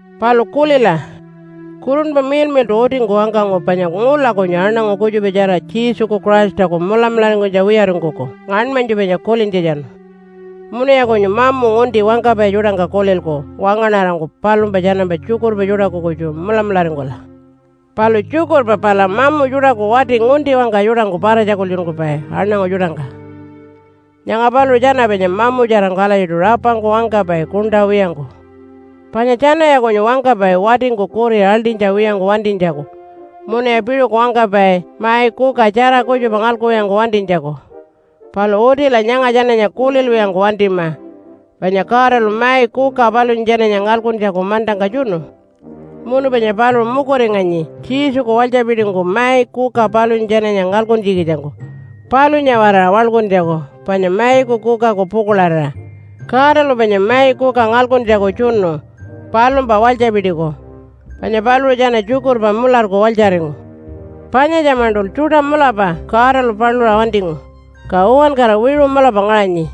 Palu kulila! Kurunpa Miḻmiḻṯu utingku wangkangu panya ngula kunyu aṉangu kutjupatjara Jesuku Christaku mulamularingkunytja wiyaringkuku ngaṉmanytju panya kulintjatjanu. Munuya kunyu mamu ngunti wangkapai tjuṯangka kulilku wangaṉarangku palumpa tjanampa tjukurpa tjuṯaku kutju mulamularingkula. Palu tjukurpa pala mamu tjuṯaku wati ngunti-wangka tjuṯangku para-tjakultjunkupai aṉangu tjuṯangka. Nyanga paluṟu tjana panya mamutjarangku alatjiṯu rapangku wangkapai kuṉṯa wiyangku. Panya tjanaya kunyu wangkapai watingku kuri aḻṯinytja wiyangku wantinytjaku, munuya piṟuku wangkapai mai kuka tjara kutjupa ngalkuwiyangku wantinytjaku. Palu utila nyanga tjananya kulilwiyangku wantima, panya Godalu mai kuka palunya tjananya ngalkuntjaku mantangka tjunu. Munu panya paluṟu mukuringanyi Jesuku walytjapitingku mai kuka palunya tjananya ngalkuntjikitjangku palunya-waraṟa waḻkuntjaku panya maiku kukaku pukuḻarira. Godalu panya mai kuka ngalkuntjaku tjunu palumpa walytjapitiku, panya paluṟu tjana tjukurpa mularku walytjaringu. Panyatja-maṉṯul tjuṯa mulapa Godalu paluṟa wantingu, ka uwankara wiṟu mulapa ngaṟanyi.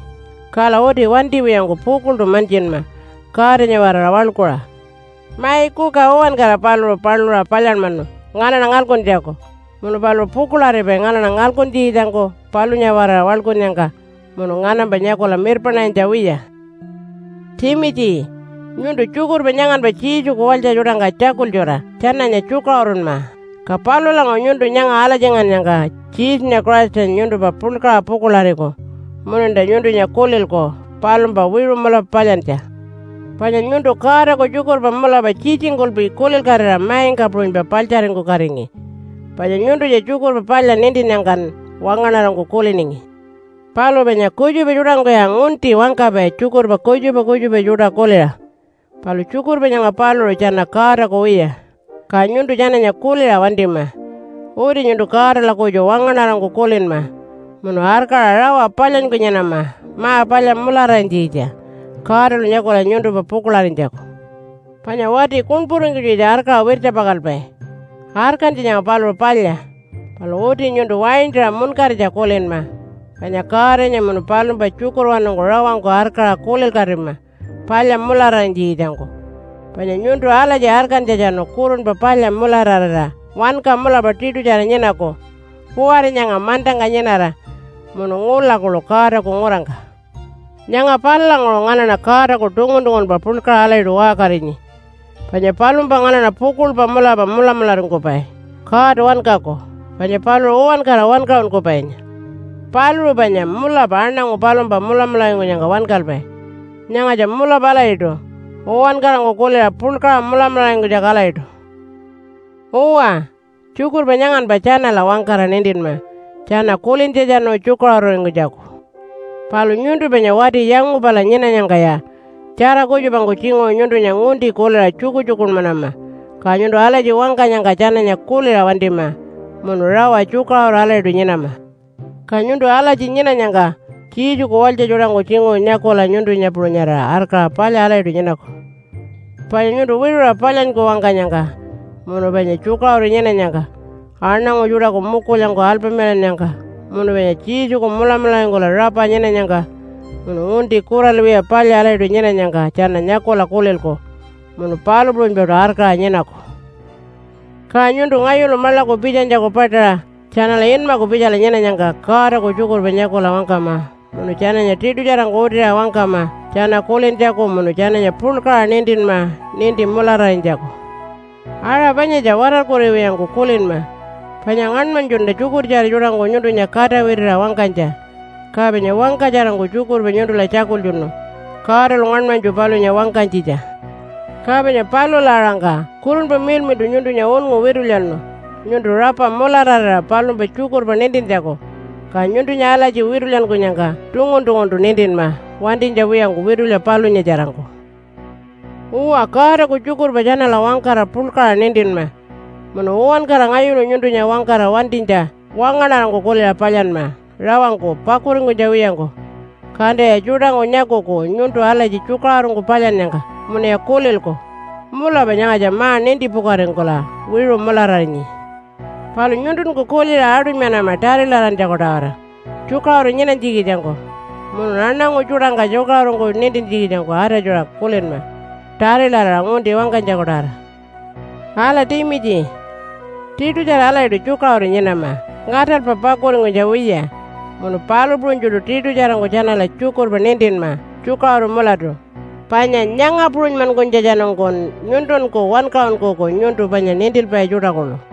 Kala uti wantiwiyangku pukuḻṯu mantjinma Godanya-waraṟa waḻkuṟa. Mai kuka uwankara paluṟu paluṟa palyanmanu nganaṉa ngalkuntjaku. Munu paluṟu pukuḻaripai nganaṉa ngalkuntjikitjangku palunya-waraṟa waḻkunnyangka munu nganampa nyakula mirpaṉarinytja wiya. Timitji, nyuntu tjukurpa nyanganpa Jesuku walytja tjuṯangka tjakultjuṟa tjananya tjukaṟurunma. Ka palulanguṟu nyuntu nyanga alatjingannyangka Jesunya Christanya nyuntumpa puḻkaṟa pukuḻariku mununta nyuntunya kulilku palumpa wiṟu mulapa palyantja. Panya nyuntu Godaku tjukurpa mulapa tjitjingkulpi kulilkatira maingka puṟunypa paḻtjaringkukatingi. Panya nyuntunya Tjukurpa Palya nintinnyangkan wangaṉarangku kuliningi. Palu panya kutjupa tjuṯangkuya ngunti wangkapai tjukurpa kutjupa kutjupa tjuṯa kuliṟa. Palu tjukurpa nyanga paluṟu tjana Godaku wiya, ka nyuntu tjananya kuliṟa wantima. Uti nyuntu Godala kutju wangaṉarangku kulinma munu arkaṟa rawa palyanyku nyinama ma-palya mulararinytjikitja Godalu nyakula nyuntumpa pukuḻarinytjaku. Panya wati kuṉpuringkunytjikitja arkaṟa wirtjapakalpai. Arkantja nyanga paluṟu palya, palu uti nyuntu waintaṟa munkaritja kulinma panya Godanya munu palumpa tjukurwanungku rawangku arkaṟa kulilkatima palya mulararinytjikitjangku. Panya nyuntu alatji arkantjatjanu kurunpa palya mulararira wanka mulapa tiṯutjara nyinaku kuwari nyanga mantangka nyinara munu ngula kuḻu Godaku ngurangka. Nyanga palulanguṟu nganaṉa Godaku tungun-tungunpa puḻkaṟa alatjiṯu waṟkarinyi. Panya palumpa nganaṉa pukuḻpa mulapa mulamularingkupai God wankaku, panya paluṟu uwankara wankaṟunkupainya. Paluṟu panya mulapa aṉangu palumpa mulamularingkunyangka wankalpai. Nyangatja mulapa alatjiṯu, uwankarangku kuliṟa puḻkaṟa mulamularingkunytjaku alatjiṯu. Uwa, tjukurpa nyanganpa tjanala wangkara nintinma tjana kulintjatjanu tjukaṟururingkunytjaku. Palu nyuntu panya wati yangupala nyinanyangkaya tjara kutjupangku tjinguṟu nyuntunya ngunti kuliṟa tjukutjukunmanama. Ka nyuntu alatji wangkanyangka tjananya kuliṟa wantima munu rawa tjukaṟuru alatjiṯu nyinama. Ka nyuntu alatji nyinanyangka Jesuku walytja tjuṯangku tjinguṟu nyakula nyuntunya puṟunyarira arkaṟa palya alatjiṯu nyinaku. Panya nyuntu wiṟuṟa palyanyku wangkanyangka, munu panya tjukaṟuru nyinanyangka, aṉangu tjuṯaku mukulyangku alpamilannyangka, munu panya Jesuku mulamularingkula rapa nyinanyangka, munu ngunti kuralwiya palya alatjiṯu nyinanyangka tjana nyakula kulilku munu palu puṟunypaṯu arkaṟa nyinaku. Ka nyuntu ngayulu maḻaku pitjanytjaku paṯaṟa tjanala inmaku pitjala nyinanyangka Godaku tjukurpa nyakula wangkama munu tjananya tiṯutjarangku utiṟa wangkama tjana kulintjaku munu tjananya puḻkaṟa nintinma ninti mulararinytjaku. Aṟa panyatja watarkuriwiyangku kulinma panya ngaṉmanytjunta tjukurtjara tjuṯangku nyuntunya kata witiṟa wangkanytja. Ka panya wangkatjarangku tjukurpa nyuntula tjakultjunu Godalu ngaṉmanytju palunya wangkanytjitja. Ka panya palula aṟangka Kurunpa Miḻmiḻṯu nyuntunya unngu witulyanu nyuntu rapa mulararira palumpa tjukurpa nintintjaku. Ka nyuntunya alatji witulyankunyangka tungun-tunguntu nintinma wantinytja wiyangku witulya palunyatjarangku. Uwa, Godaku tjukurpa tjanala wangkara puḻkaṟa nintinma. Munu uwankara ngayulu nyuntunya wangkara wantinytja wangaṉarangku kuliṟa palyanma rawangku pakuringkunytja wiyangku. Kantaya tjuṯangku nyakuku nyuntu alatji tjukaṟurungku palyannyangka, munuya kulilku, “Mulapa nyangatja ma-nintipukaringkula wiṟu mulararinyi.” Palu nyuntunku kuliṟa aṯunymanama tarilarantjaku-tawara, tjukaṟuru nyinanytjikitjangku. Munun aṉangu tjuṯangka tjukaṟurungku nintintjikitjangku atatjuṟa kulinma tarilaraṟa ngunti wangkanytjaku-tawara. Ala Timitji, tiṯutjara alatjiṯu tjukaṟuru nyinama ngaṯalpa pakuringkunytja wiya munu palu puṟunytjuṯu tiṯutjarangku tjanala tjukurpa nintinma tjukaṟuru mulatu. Panya nyanga puṟunymankunytjatjanungkun nyuntunku wankaṟunkuku nyuntu panya nintilpai tjuṯa kuḻu.